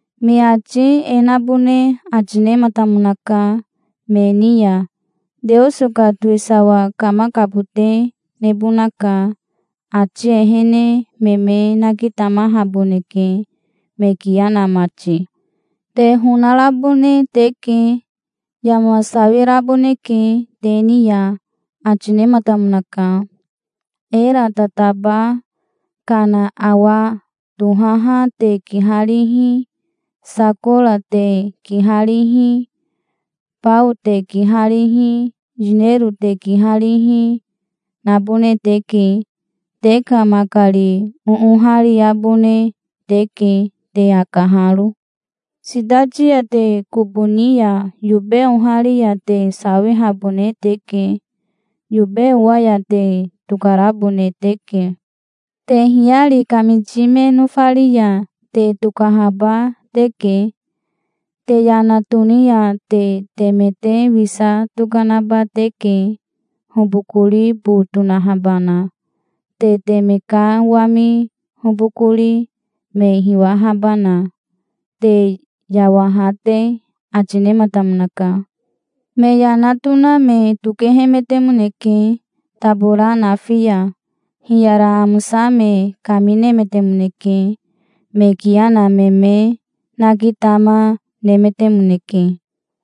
Me ati e nabone ati nematamonaka me ni ya: Teoso ka towisawa kamakabote nebonaka. Ati ehene me me nakitamahaboneke, me kiya na mati. "Te honarabone teke. Yama sawiraboneke te ni ya", ati nematamonaka. "Era tataba kana awa tohaha te kiharihi, sakora te kiharihi, bao te kiharihi, yinero te kiharihi, nabone teke. Te ka makari oohariabone teke, te akaharo. Sitati ya te kobo ni ya yobe ohari ya te sawihabone teke. Yobe owa ya te tokarabone teke. Te hiyari kamiti me nofari ya te tokahaba teke. Te yana toni ya te teme te wisa tokanaba teke, hobokori bo tonahabana, te teme ka wami hobokori, me hiwahabana, te yawaha te", ati nematamonaka. Me yana tona me tokehemetemoneke tabora nafi ya. Hiyara amosa me kaminemetemoneke. Me kiya na me me nakitama nemetemoneke.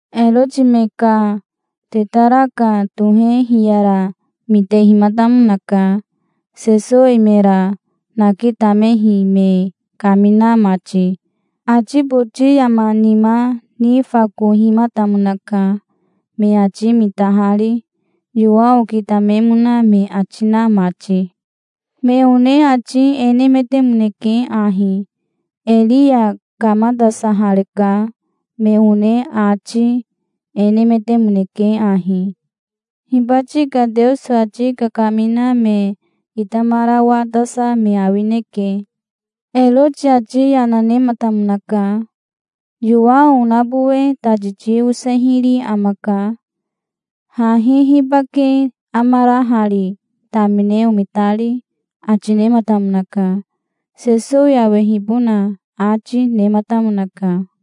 Eroti me ka tetaraka tohe hiyara mitehimatamonaka, Sesowi mera nakitamehi me kamina mati. Ati boti yama nima nifakohimatamonaka, me ati mitahari, Yowao kitamemona me ati na mati. Me one ati e nemetemoneke ahi: "Eria kamatasahareka". Me one ati e nemetemoneke ahi: "Hibati ka Teoso ati kakamina me kitamarawatasa me awineke". Eroti ati yana nematamonaka. "Yowao onabowe tati ti osehiri amaka. Hahi hibake amara hari, tamine omitari?" ati nematamonaka. Sesowi awehibona ati nematamonaka.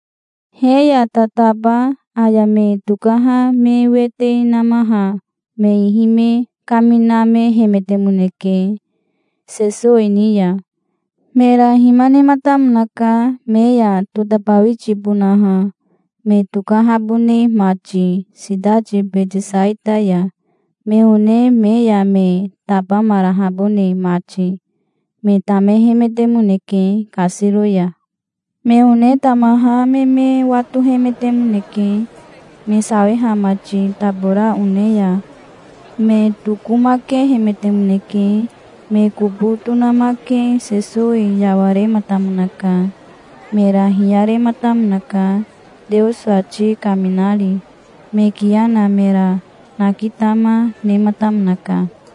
He ya tataba aya me tokaha me wete namaha me ihi me kaminamehemetemoneke, Sesowi ni ya. Mera hima nematamonaka me ya totabawitibonaha, me tokahabone mati sitati Betesaita ya, me one me ya me tabamarahabone mati. Me tamehemetemoneke kasiro ya. Me one tamaha me me watohemetemoneke, me sawiha mati tabora one ya. Me tokomakehemetemoneke. Me kobo tonamake Sesowi yawarematamonaka. Mera hiyarematamonaka, Teoso ati kaminari. Me kiya na mera nakitama, nematamonaka.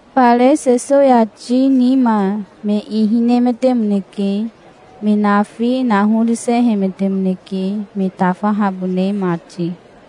Fare Sesowi ati nima me ihi nemetemoneke. Me nafi nahorisehemetemoneke, me tafahabone mati.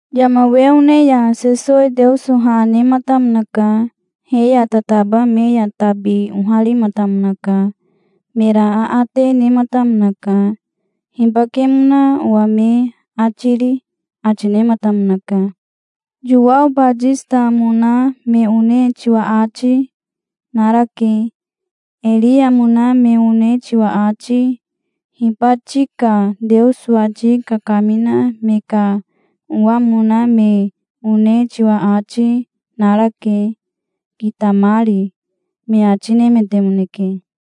Yama we one ya Sesowi Teoso ha nematamonaka. He ya tataba me ya tabi oharimatamonaka. Mera aate nematamonaka. "Hibakemona owa me ati ri?" ati nematamonaka. "Yowao Batisitamona me one tiwa ati narake. Eriamona me one tiwa ati, hibati ka Teoso ati kakamina me ka owamona me one tiwa ati, narake, kitamari", me ati nemetemoneke.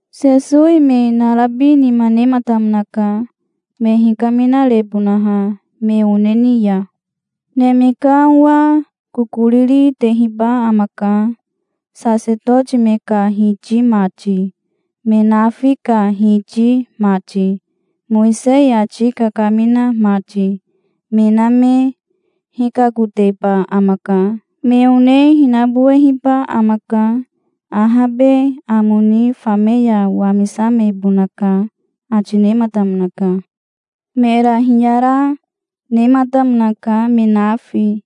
Sesowi me narabi nima nematamonaka, me hikaminarebonaha me one ni ya. "Neme ka Owa kokoriri tehiba amaka. Sasetoti me ka hiti mati, me nafi ka hiti mati, Mowisei ati kakamina mati, me na me hikakoteba amaka. Me one hinabowehiba amaka. Ahabe amo ni fame ya wamisamebonaka", ati nematamonaka. Mera hiyara nematamonaka me nafi.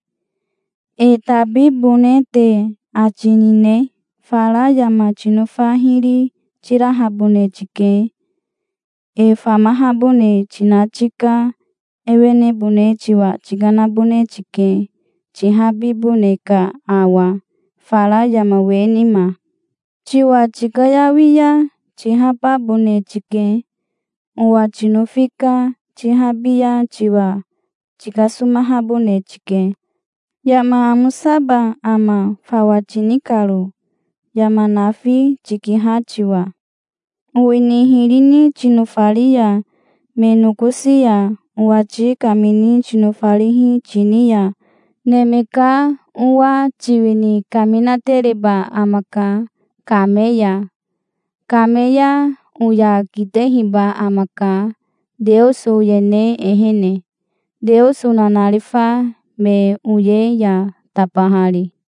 "E tabibone te ati nine? Fara yama tinofa hiri tirahabone tike. E famahabone tina tika ewenebone tiwa tikanabone tike, tihabibone ka awa, fara yama we nima. Tiwa tikayawi ya tihababone tike. Owa tinofi ka tihabi ya tiwa tikasomahabone tike. Yama amosaba ama, fawa tini karo, yama nafi tikiha tiwa? Owini hiri ni tinofari ya me nokosi ya owati kamini tinofarihi tini ya Neme ka Owa tiwini kaminatereba amaka kame ya. Kame ya oya kitehiba amaka Teoso oyene ehene, Teoso nanarifa me oye ya tabahari.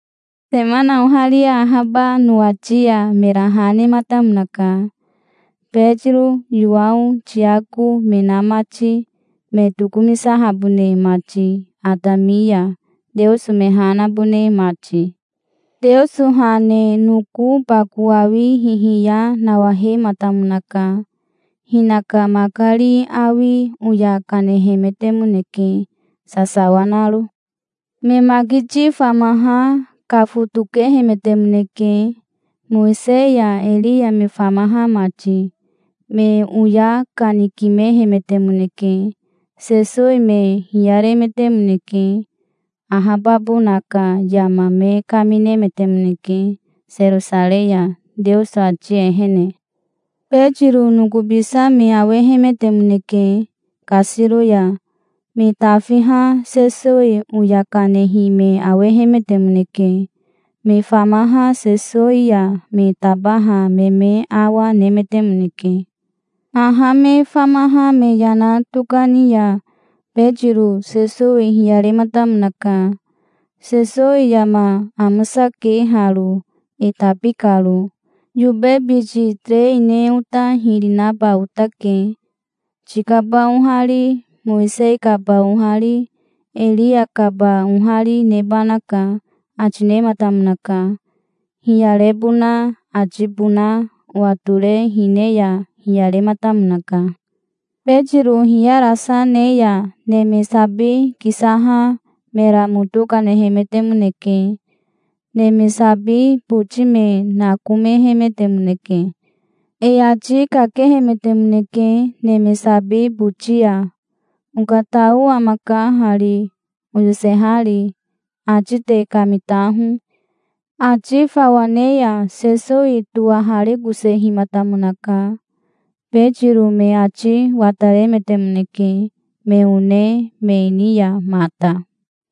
Semana oharia ahaba nowati ya mera ha nematamonaka, Betiro, Yowao, Tiako me na mati, me tokomisahabone mati atami ya, Teoso me ha nabone mati. Teoso ha ne noko bako awi hihiya nawahematamonaka. Hinaka makari awi oya kanehemetemoneke, sasawa naro. Me makiti famaha kafotokehemetemoneke, Mowisei ya Eria me famaha mati. Me oya kanikimehemetemoneke. Sesowi me hiyaremetemoneke. Ahababona ka yama me kaminemetemoneke Serosarei ya, Teoso ati ehene. Betiro nokobisa me awehemetemoneke kasiro ya. Me tafiha Sesowi oya kanehi me awehemetemoneke. Me famaha Sesowi ya me tabaha me me awa nemetemoneke. Haha me famaha me yana tokani ya Betiro Sesowi hiyarematamonaka. "Sesowi yama amosake haro, e tabi karo. Yobe biti terei ne ota hiri naba otake. Tikaba ohari, Mowisei kaba ohari, Eria kaba ohari nebanaka", ati nematamonaka. Hiyarebona atibona watore hine ya hiyarematamonaka. Betiro hiyarasa ne ya neme sabi kisaha mera moto kanehemetemoneke. Neme sabi boti me nakomehemetemoneke. E ati kakehemetemoneke neme sabi boti ya. "Okatao amaka hari, oyosehari. Ati te kamitaho". Ati fawa ne ya Sesowi towaharikosehimatamonaka. Betiro me ati wataremetemoneke, me one me ni ya mata.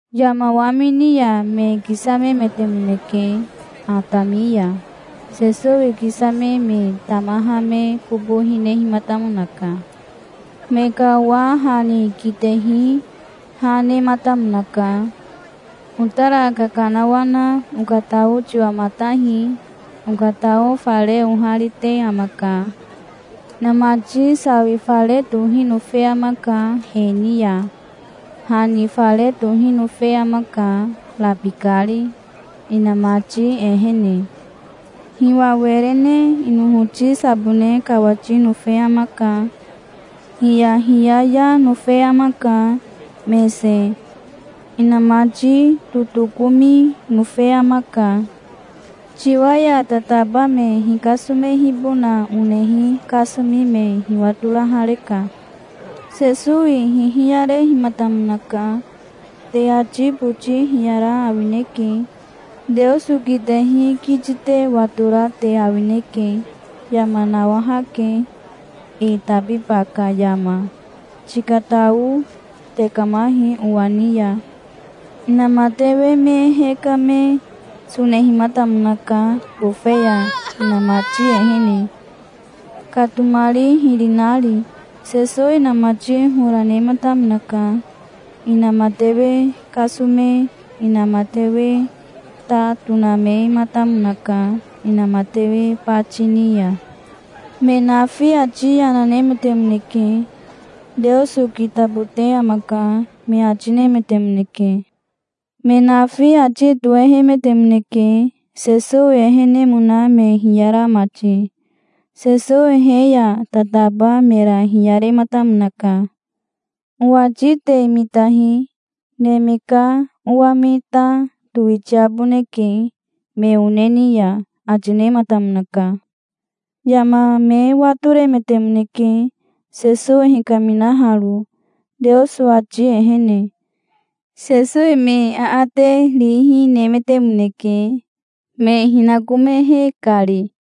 Yama wamini ya me kisamemetemoneke atami ya. Sesowi kisame me tamaha me kobo hinehimatamonaka. Me ka owa ha ni kitehi ha nematamonaka. "Otara kakanawana okatao tiwamatahi. Okatao fare oharite amaka. Inamati sawi fare tohi nofe amaka he ni ya. Ha ni fare tohi nofe amaka, rabikari, inamati ehene. Hiwa were ne inohoti sabone kawati nofe amaka. Hiyahiyaya nofe amaka, mese, inamati ehene. Inamati totokomi nofe amaka. Tiwa ya tataba me hikasomehibona onehi kasomi me hiwatorahareka". Sesowi hihiyarehimatamonaka. "Te ati boti hiyara awineke. Teoso kitehi kiti te watora te awineke. Yama nawahake e tabiba ka yama. Tikatao tekamahi owa ni ya". Inamatewe me hekame sonehimatamonaka bofe ya inamati ehene, katomari hiri nari. Sesowi inamati hora nematamonaka. Inamatewe kasome inamatewe ta tonamematamonaka inamatewe bati ni ya. Me nafi ati yana nemetemoneke. "Teoso kitabote amaka", me ati nemetemoneke. Me nafi ati tohehemetemoneke, Sesowi ehenemona me hiyara mati. Sesowi he ya tataba mera hiyarematamonaka. "Owati te mitahi. Neme ka Owa me ta towitiaboneke me one ni ya", ati nematamonaka. Yama me watoremetemoneke, Sesowi hikaminaharo, Teoso ati ehene. Sesowi me aate rihi nemetemoneke, me hinakomehe kari.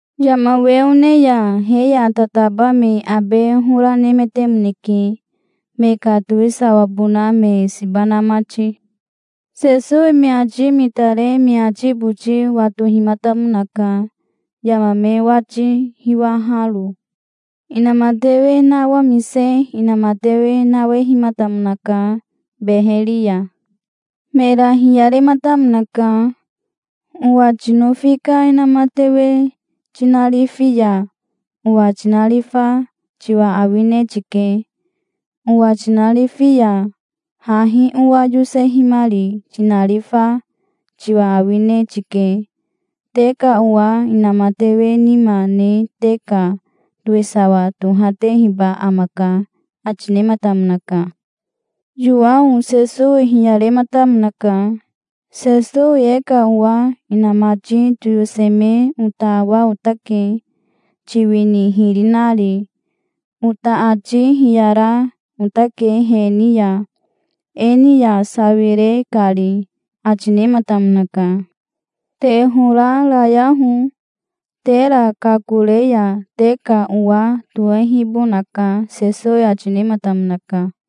Yama we one ya he ya tataba me abe hora nemetemoneke, me ka towisawabona me siba na mati. Sesowi me ati mitare me ati boti watohimatamonaka, yama me wati hiwaharo. Inamatewe nawamise inamatewe nawehimatamonaka beheri ya. Mera hiyarematamonaka. "Owa tinofi ka inamatewe tinarifi ya owa tinarifa tiwa awine tike. Owa tinarifi ya, hahi owa yosehimari tinarifa tiwa awine tike. Te ka owa inamatewe nima ne te ka towisawa tohatehiba amaka", ati nematamonaka. Yowao Sesowi hiyarematamonaka. "Sesowi e ka owa inamati toyoseme ota awa otake, tiwini hiri nari. Ota ati hiyara otake he ni ya, e ni ya sawire kari", ati nematamonaka. "Te hora rayaho. Tera kakore ya te ka owa tohehibonaka", Sesowi ati nematamonaka.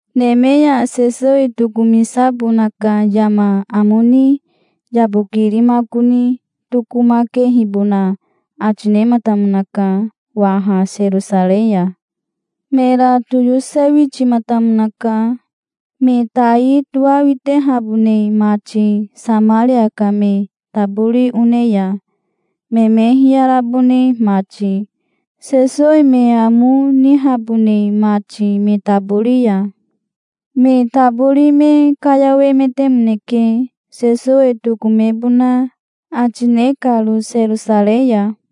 Neme ya Sesowi tokomisabona ka yama amo ni yabokirimakoni tokomakehibona ati nematamonaka waha Serosarei ya. Mera toyosewitimatamonaka, me tai toawitehabone mati Samaria ka me tabori one ya, me me hiyarabone mati, Sesowi me amo nihabone mati me tabori ya. Me tabori me kayawemetemoneke, Sesowi tokomebona ati ne karo Serosarei ya.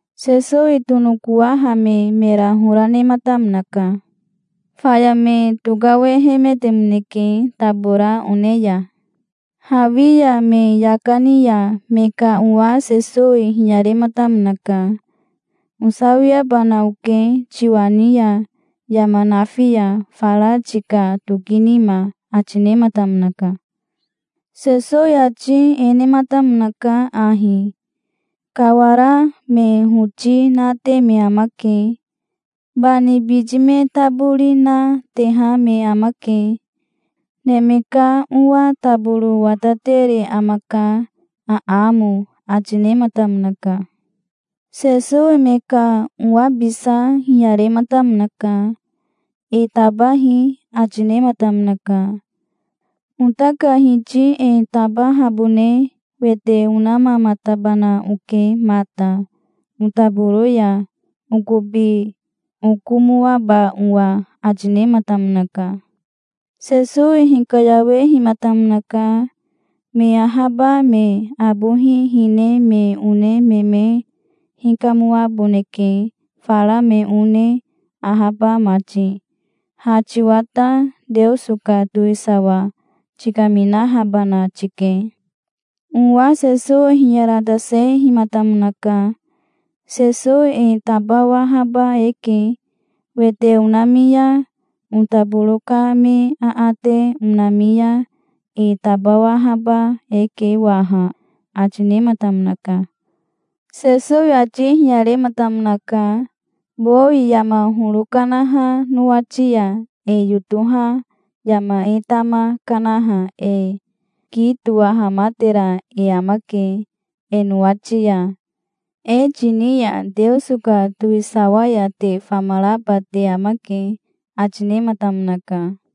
Sesowi tonokowahame mera hora nematamonaka. Faya me tokawehemetemoneke tabora one ya. Hawi ya me yaka ni ya me ka owa Sesowi hiyarematamonaka. "Osawiabana oke tiwa ni ya, yama nafi ya, fara tika toki nima", ati nematamonaka. Sesowi ati e nematamonaka ahi: "Kawara me hoti nate me amake. Bani biti me tabori na, teha me amake. Neme ka Owa taboro watatere amaka, aamo", ati nematamonaka. Sesowi me ka owabisa hiyarematamonaka. "E tabahi", ati nematamonaka. "Ota ka Hiti e tabahabone wete onamamatabana oke mata, otaboro ya, okobi okomoaba owa", ati nematamonaka. Sesowi hikayawehimatamonaka. "Me ahaba me abohi hine me one me me hikamoaboneke fara me one ahaba mati. Ha tiwa ta, Teoso ka towisawa tikaminahabana tike". Owa Sesowi hiyaratasehimatamonaka. "Sesowi e tabawahaba eke. Wete onami ya otaboro ka me aate onami ya e tabawahaba eke waha", ati nematamonaka. Sesowi ati hiyarematamonaka. "Bowi yama horo kanaha nowati ya e yotoha yama e tama kanaha e ki towahamatera e amake e nowati ya. E tini ya Teoso ka towisawa ya te famaraba te amake", ati nematamonaka.